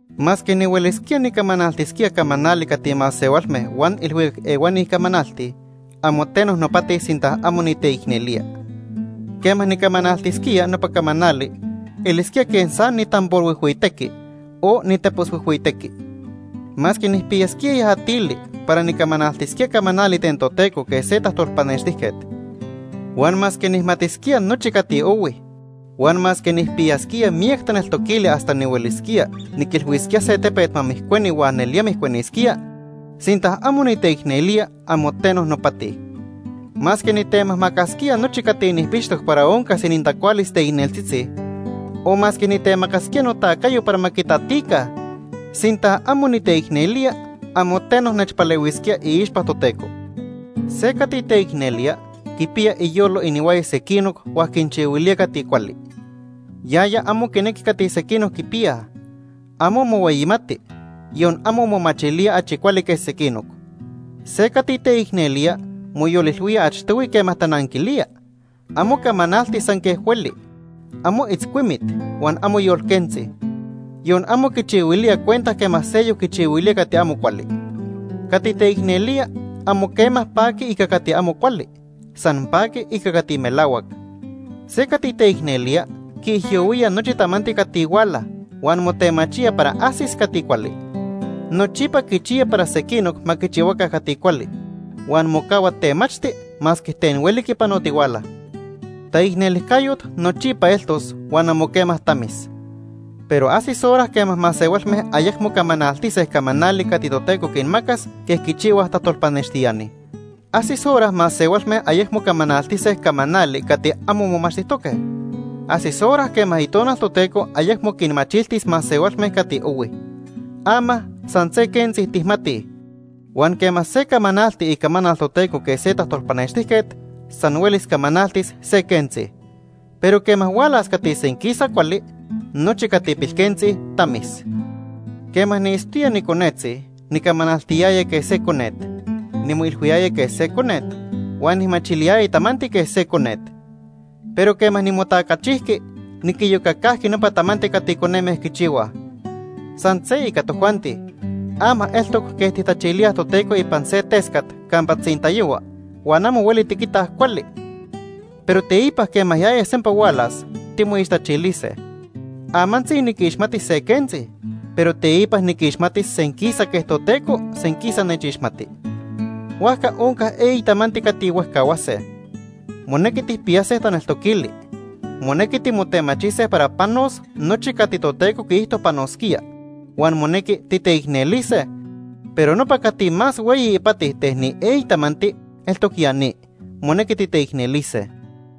Masque nihuelisquía nicamanaltisquía camanali cati masehualme huan ilhuicac ehuani camanaltij, amo teno nopati sinta amo niteicnelía. Quema nicamanaltisquía nopa camanali elisquía quej san nitamborhuijhuitequi o niteposhuijhuitequi. Masque nijpiyasquía yajatili para nicamanaltisquía camanali ten Toteco quej se tajtolpanextijquet, huan masque nijmatisquía nochi cati ohui huan masque nijpiyasquía miyac taneltoquili hasta nihuelisquía niquilhuisquía se tepet ma mijcueni huan nelía mijcuenisquía, sinta amo niteicnelía, amo teno nopati. Masque nitemajmacasquía nochi cati nijpixtoc para oncas inintacualis teicneltzitzi, o masque nitemacasquía notacayo para ma quitatica, sinta amo niteicnelía, amo teno nechpalehuisquía iixpa Toteco. Se cati teicnelía quipiya iyolo inihuaya sequinoc huan quinchihuilía cati cuali. Yaya amo quinequi cati sequinoc quipiyaj. Amo mohueyimati, yon amo momachilía achi cuali que sequinoc. Se cati teicnelía moyolilhuía achtohui quema tananquilía. Amo camanalti san quej hueli. Amo itzcuimit huan amo yolquentzi. Yon amo quichihuilía cuenta quema seyoc quichihuilía cati amo cuali. Cati teicnelía amo quema paqui ica cati amo cuali, san paqui ica cati melahuac. Se cati teicnelía quiijyohuía nochi tamanti cati huala, huan motemachía para ajsis cati cuali. Nochipa quichiya para sequinoc ma quichihuaca cati cuali, huan mocahua temachti masque ten hueli quipanotihuala. Taicnelijcayot nochipa eltos huan amo quema tamis. Pero ajsis hora quema masehualme ayecmo camanaltise camanali cati Toteco quinmacas quej quichihuaj tajtolpanextiani. Ajsis hora masehualme ayecmo camanaltise camanali cati amo momachtijtoque. Ajsis hora quema Itonal Toteco ayecmo quinmachiltis masehualme cati ohui. Ama san se quentzi tijmatij, huan quema se camanalti icamanal Toteco quej se tajtolpanextijquet, san huelis camanaltis se quentzi. Pero quema hualas cati senquisa cuali, nochi cati pilquentzi tamis. Quema niitztoya niconetzi nicamanaltiyaya quej se conet, nimoilhuiyaya quej se conet, huan nijmachiliyaya tamanti quej se conet. Pero quema nimotacachijqui, niquiyocacajqui nopa tamanti cati coneme quichihuaj. San se ica tojuanti. Ama eltoc quej tijtachilíaj Toteco ipan se tescat campa tzintayohua huan amo hueli tiquitaj cuali, pero teipa quema yaya sempa hualas, timoixtachilise. Amantzi niquixmati se quentzi, pero teipa niquixmatis senquisa quej Toteco senquisa nechixmati. Huajca onca eyi tamanti cati huejcahuase. Monequi tijpiyase taneltoquili. Monequi timotemachise para panos nochi cati Toteco quiijto panosquía, huan monequi titeicnelise, pero nopa cati más hueyi ipati ten ni eyi tamanti eltoc ya ni, monequi titeicnelise.